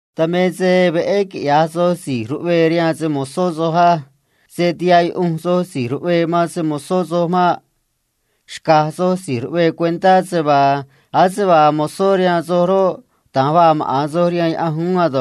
Dan me se veꞌé quiꞌya̱j soj si̱j ruꞌvee rihaan se‑mo̱zó soj uún á. Se̱ tihaꞌ yuꞌunj soj si̱j ruꞌvee man se‑mo̱zó soj maꞌ. Xca̱j soj si̱j ruꞌvee cuentá se vaa ase vaa mozó rihaan soj roꞌ, da̱nj vaa maꞌa̱n soj rihaan Diose̱ uún ei.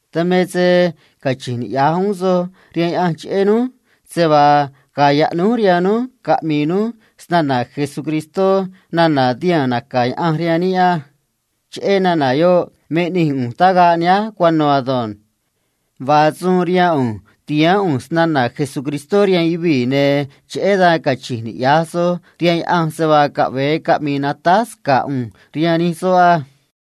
Dan me se cachi̱nj niꞌya̱j uún soj rihaan Diose̱ cheꞌé núj se vaa ga̱a̱ yaꞌnúj rihaan núj caꞌmi̱i̱ núj se‑na̱na̱ Jesucristó nana̱ tihaa̱n naca̱ Diose̱ rihaan níꞌ á. Cheꞌé nana̱ yoꞌ me ꞌnij ꞌu̱nj tagaꞌ nihánj cuano̱ ei. Vaa suun rihaan ꞌu̱nj ti̱haán ꞌu̱nj se‑na̱na̱ Jesucristó rihaan yuvii̱, ne̱ cheꞌé dan cachi̱nj niꞌya̱j soj rihaan Diose̱ se vaa caꞌve̱e caꞌmi̱i̱ natáj sca̱ꞌ ꞌu̱nj rihaan nij soꞌ ei.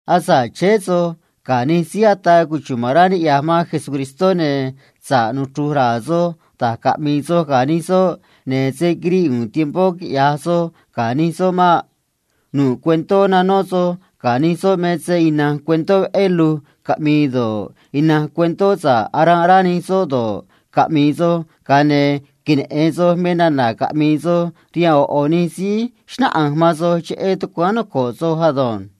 Asa̱ꞌ chéé soj ga̱ nij síí ataa cuchuma̱n rá ni̱ꞌyaj man Jesucristó, ne̱ sa̱ꞌ nuchru̱j ra̱a̱ soj da̱j caꞌmi̱i̱ soj ga̱ nij soꞌ, ne̱ se̱ quiriꞌ u̱u̱n tiempó quiꞌya̱j soj ga̱ nij soꞌ mei. Nu̱ꞌ cuentó nanó soj ga̱ nij soꞌ me se ina̱nj cuentó veꞌé do̱ꞌ, ina̱nj cuentó sa̱ꞌ aranꞌ rá nij soꞌ do̱ꞌ, ina̱nj cuentó aꞌmii danj Diose̱ do̱ꞌ, caꞌmi̱i̱ soj, ne̱ queneꞌe̱n soj me nana̱ caꞌmi̱i̱ soj rihaan ꞌo̱ ꞌo̱ síí xnáꞌanj man soj cheꞌé tucuáán noco̱ꞌ soj ado̱nj.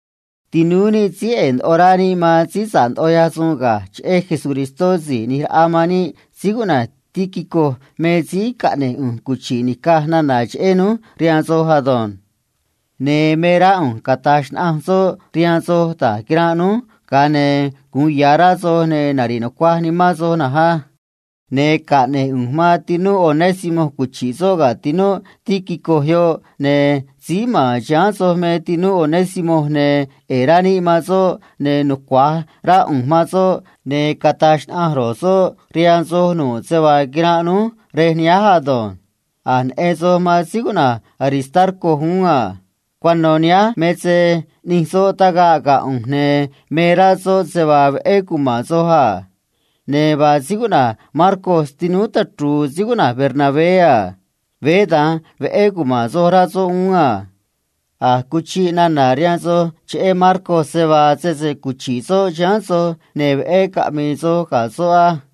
Tinúú níꞌ síí ꞌe̱e̱ ndoꞌo rá níꞌ man síí sa̱ꞌ ndoꞌo ꞌyaj suun ga̱j cheꞌé síí ꞌni̱j raꞌa man níꞌ síí cuꞌna̱j Tíquico me síí caꞌne̱j ꞌu̱nj cuchi̱ꞌ ni̱caj nana̱ cheꞌé núj rihaan soj ei. Ne̱ me rá ꞌu̱nj cata̱j xnaꞌanj soꞌ rihaan soj da̱j quiranꞌ núj, ga̱a ne̱ gu̱un ya̱ rá soj, ne̱ nari̱ꞌ nucuaj nimán soj ei. Ne̱ caꞌne̱j ꞌu̱nj man tinúꞌ Onésimo cuchi̱ꞌ soꞌ ga̱ tinúꞌ Tíquico yoꞌ, ne̱ síí ma̱n chiháán soj me tinúꞌ Onésimo, ne̱ ꞌe̱e̱ rá níꞌ man soꞌ, ne̱ nucua̱j rá ꞌu̱nj man soꞌ, ne̱ cata̱j xnaꞌanj ro̱j soꞌ rihaan soj nu̱ꞌ se vaa quiranꞌ núj rej nihánj ei. A̱j neꞌen soj man síí cuꞌna̱j Aristarco uún a. Cuano̱ nihánj me se ꞌni̱j soꞌ tagaꞌ ga̱ ꞌu̱nj, ne̱ me rá soꞌ se vaa veꞌé cuma̱n soj a. Ne̱ vaa síí cuꞌna̱j Marcos tinúú tachru̱u̱ síí cuꞌna̱j Bernabé a. Veé da̱nj veꞌé cuma̱n soj, rá soꞌ uún a. A̱j cuchiꞌ nana̱ rihaan soj cheꞌé síí cuꞌna̱j Marcos, se vaa sese cuchi̱ꞌ soꞌ chiháán soj, ne̱ veꞌé caꞌmi̱i̱ soj ga̱ soꞌ á.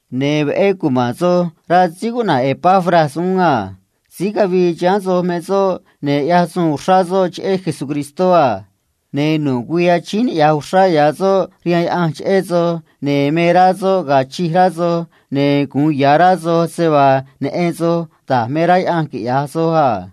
Ne̱ veꞌé cuma̱n soj, rá síí cuꞌna̱j Epafras uún a. Síí cavii chiháán soj me soꞌ, ne̱ ꞌyaj suun uxrá soꞌ cheꞌé Jesucristó, ne̱ nu̱ꞌ güii achíín niꞌya̱j uxrá soꞌ rihaan Diose̱ cheꞌé soj, ne̱ me rá soꞌ ga̱a̱ chij rá soj, ne̱ gu̱un ya̱ rá soj se vaa neꞌen soj da̱j me rá Diose̱ quiꞌya̱j soj,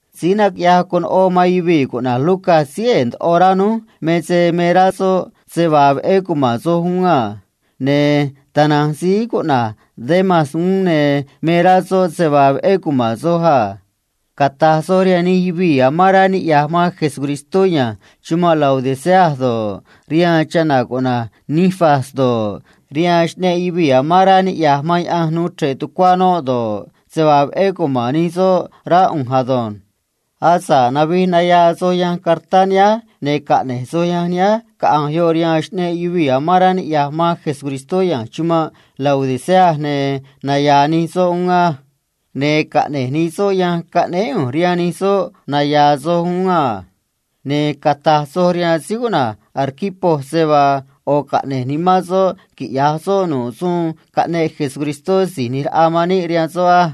Doctor síí cuꞌna̱j Lucas síí ꞌe̱e̱ ndoꞌo rá níꞌ me se me rá uún soꞌ se vaa veꞌé cuma̱n soj a. Ne̱ tana̱nj síí cuꞌna̱j Demas uún, ne̱ me rá soꞌ se vaa veꞌé cuma̱n soj a. Cata̱j soj rihaan nij yuvii̱ amán rá niꞌya̱j man Jesucristó ya̱nj chumanꞌ Laodicea do̱ꞌ, rihaan chana̱ cuꞌna̱j Ninfas do̱ꞌ, rihaan nij yuvii̱ amán rá naꞌvíj rihaan Diose̱ tucuá noꞌ do̱ꞌ, se vaa veꞌé cuma̱n nij soꞌ, rá ꞌu̱nj ei. Asa̱ꞌ navij nayaa soj yanj cartá nihánj, ne̱ caꞌne̱j soj yanj nihánj caꞌa̱nj yoꞌ rihaan nij yuvii̱ amán rá niꞌya̱j man Jesucristó ya̱nj chumanꞌ Laodicea, ne̱ naya̱a̱ nij soꞌ uún á. Ne̱ caꞌne̱j nij soꞌ yanj caꞌnéé ꞌu̱nj rihaan nij soꞌ, naya̱a̱ soj uún a. Ne̱ cata̱j soj rihaan síí cuꞌna̱j Arquipo se vaa ꞌo̱ caꞌne̱j nimán soꞌ quiꞌya̱j suun soꞌ nu̱ꞌ suun caꞌneꞌ síí ꞌni̱j raꞌa man níꞌ rihaan soꞌ á.